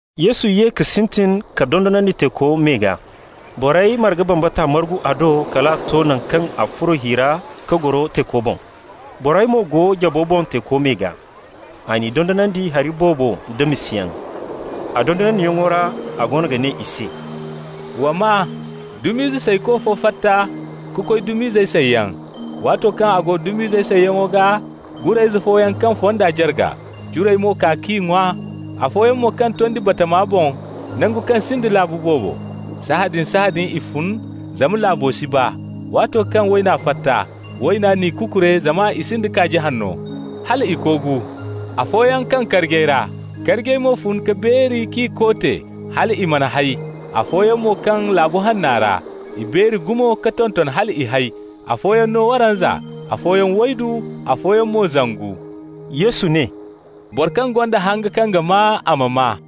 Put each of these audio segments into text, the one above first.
Yesu ye ka sintin ka dondonandi teeko me gaa. Borey marga bambata margu a do kal a to naŋ kaŋ a furo hi ra ka goro teeko boŋ. Borey mo go jabo boŋ teeko me gaa. A n'i dondonandi hari boobo nda misayaŋ. A dondonandiyaŋo ra a go ga ne i se: «Wa maa: dum'izey sayko fo fatta ka koy dum'izey sayyaŋ. Waato kaŋ a go dum'izey sayyaŋo gaa, gurayze fooyaŋ kaŋ fonda jarga, curey mo kaa k'i ŋwa. Afooyaŋ mo kaŋ tondi batama boŋ, nangu kaŋ sinda laabu boobo. Sahãadin-sahãadin i fun, zama laabo si baa. Waato kaŋ wayna fatta, wayna n'i kukure zama i sinda kaaji hanno, hal i koogu. Afooyaŋ kaŋ karjey ra. Karjey mo fun ka beeri k'i koote hal i mana hay. Afooyaŋ mo kaŋ laabu hanno ra. I beeri gumo ka tonton hal i hay, afooyaŋ no waranza, afooyaŋ waydu, afooyaŋ mo zangu.» Yesu ne: «Boro kaŋ gonda hanga kaŋ ga maa, a ma maa!»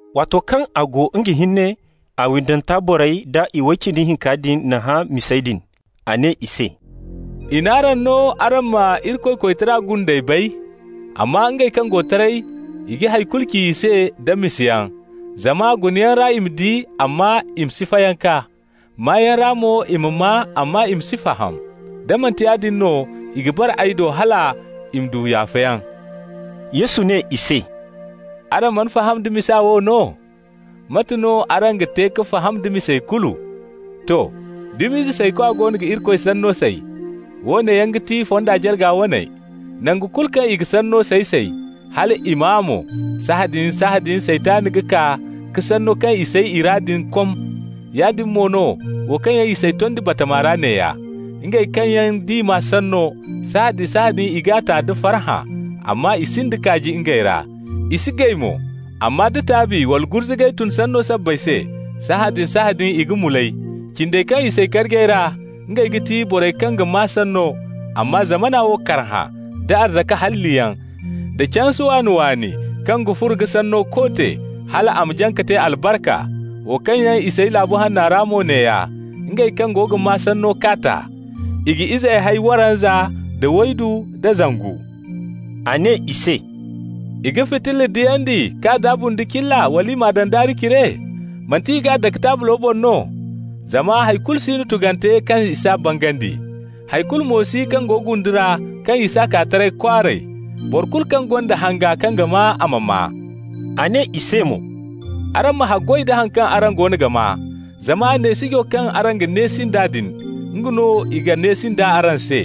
Waato kaŋ a go nga hinne, a windanta borey da iway cindi hinka din n'a hã misey din. A ne i se: «I n'araŋ no araŋ ma Irikoy koytara gundey bay. Amma ngey kaŋ go taray, i ga hay kulu ci i se nda misayaŋ. Zama ‹gunayaŋ ra i ma di, amma i ma si fayanka. Maayaŋ ra mo i ma maa, amma i ma si faham. Da manti yaadin no i ga bare ay do hal i ma du yaafayaŋ.›» Yesu ne i se: «Araŋ mana faham da misa wo no? Mate no araŋ ga te ka faham da misey kulu? To! Dum'izey saykwa goono ga Irikoy Sanno say. Woone yaŋ ga ti fonda jarga waney: nangu kulu kaŋ i ga sanno say-say, hal i maa mo, sahãadin-sahãadin Saytan ga kaa ka sanno kaŋ i say i ra din kom. Yaadin mo no wo kaŋ yaŋ i say tondi batama ra neeya: ngey kaŋ yaŋ d'i maa sanno, sahãadin-sahãadin i g'a ta da farhã, amma i sinda kaaji ngey ra. I si gay mo, amma da taabi wala gurzugay tun sanno sabbay se, sahãadin-sahãadin i ga mulay. Cindey kaŋ i say karjey ra, ngey ga ti borey kaŋ ga maa sanno, amma zamana wo karhã, da arzaka halliyaŋ, da canse waani-waani kaŋ ga furo ga sanno koote, hal a ma jaŋ ka te albarka. Wo kaŋ yaŋ i say laabu hanno ra mo neeya: ngey kaŋ go ga maa sanno k'a ta. I ga izey hay waranza, da waydu da zangu.» A ne i se: «I ga fitilla diyandi k'a daabu nda cilla, wala i m'a daŋ daari cire? Manti i g'a dake taablo boŋ no? Zama hay kulu si no tugante kaŋ i s'a bangandi. Hay kulu mo si kaŋ go gundu ra kaŋ i s'a kaa taray kwaaray. Boro kulu kaŋ gonda hanga kaŋ ga maa, a ma maa!» A ne i se mo: «Araŋ ma haggoy da haŋ kaŋ araŋ goono ga maa! Zama neesijo kaŋ araŋ ga neesi nd'a din, nga no i ga neesi nd'a araŋ se,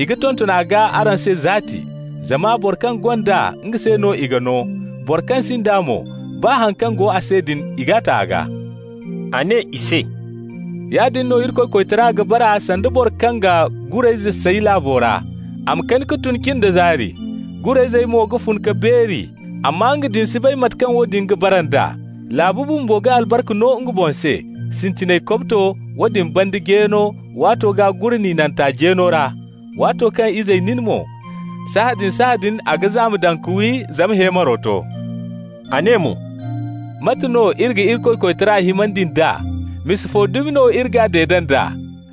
i ga tonton a gaa araŋ se zaati. Zama boro kaŋ gonda, nga se no i ga no. Boro kaŋ sinda mo, baa haŋ kaŋ go a se din, i g'a ta a gaa.» A ne i se: «Yaadin no Irikoy koytara ga bara sanda boro kaŋ ga gurayzey say laabo ra. A ma kani ka tun cin da zaari. Gurayzey mo ma fun ka beeri, amma nga din si bay mate kaŋ woodin ga bara nd'a. Laabu bumbo ga albarka no nga boŋ se, sintinay kobto, woodin banda jeeno, waato gaa gure ninante jeeno ra. Waato kaŋ izey nin mo, sahãadin-sahãadin a ga zaama daŋ ka wi, zama heemaro to.» A ne mo: «Mate no iri ga Irikoy koytara himandi nd'a? Misa fo dumi no iri g'a deede nd'a?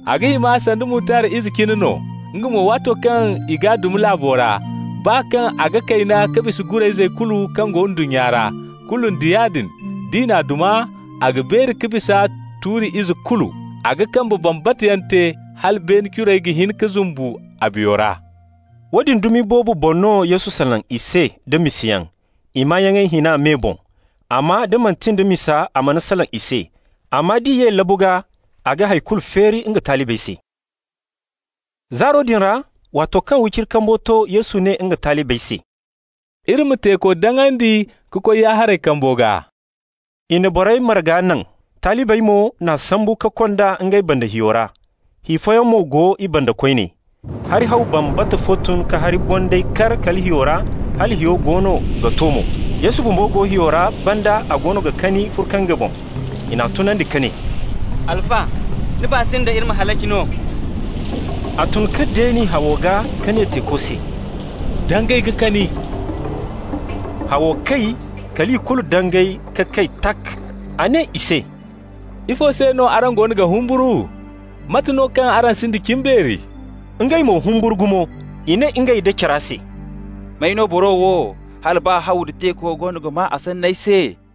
A ga hima sanda mutard ize cine no. Nga mo waato kaŋ i g'a duma laabo ra, baa kaŋ a ga kayna ka bisa gurayzey kulu kaŋ go ndunnya ra, kulu nda yaadin, d'i n'a duma a ga beeri ka bisa tuuri ize kulu. A ga kambe bambata yaŋ te hala beene curey ga hin ka zumbu a biyo ra.» Woodin dumi boobo boŋ no Yesu salaŋ i se da misayaŋ, i maayaŋey hina me boŋ. Amma da manti nda misa, a mana salaŋ i se. Amma d'i ye labu gaa, a ga hay kulu feeri nga talibey se. Zaaro din ra, waato kaŋ wiciri kambo to, Yesu ne nga talibey se: «Iri ma teeko daŋandi ka koy ya-haray kambo gaa.» I na borey marga naŋ. Talibey mo n'a sambu ka kond'a ngey banda hiyo ra. Hi fooyaŋ mo go i banda koyne. Hari haw bambata fo tun ka hari bondayey kar kala hiyo ra, hala hiyo goono ga to mo. Yesu bumbo go hiyo ra banda, a goono ga kani furkange boŋ. I n'a tunandi ka ne: «Alfa, ni baa si nda iri ma halaci no?» A tun ka deeni hawo gaa, ka ne teeko se: «Dangay ka kani!» Hawo kay, kal i kulu dangay ka kay, tak! A ne i se: «Ifo se no araŋ goono ga humburu? Mate no kaŋ araŋ sinda cimbeeri?» Ngey mo humburu gumo. I ne ngey nda cara se: «May no boro wo, hala baa haw nda teeko goono ga maa a sanney se?»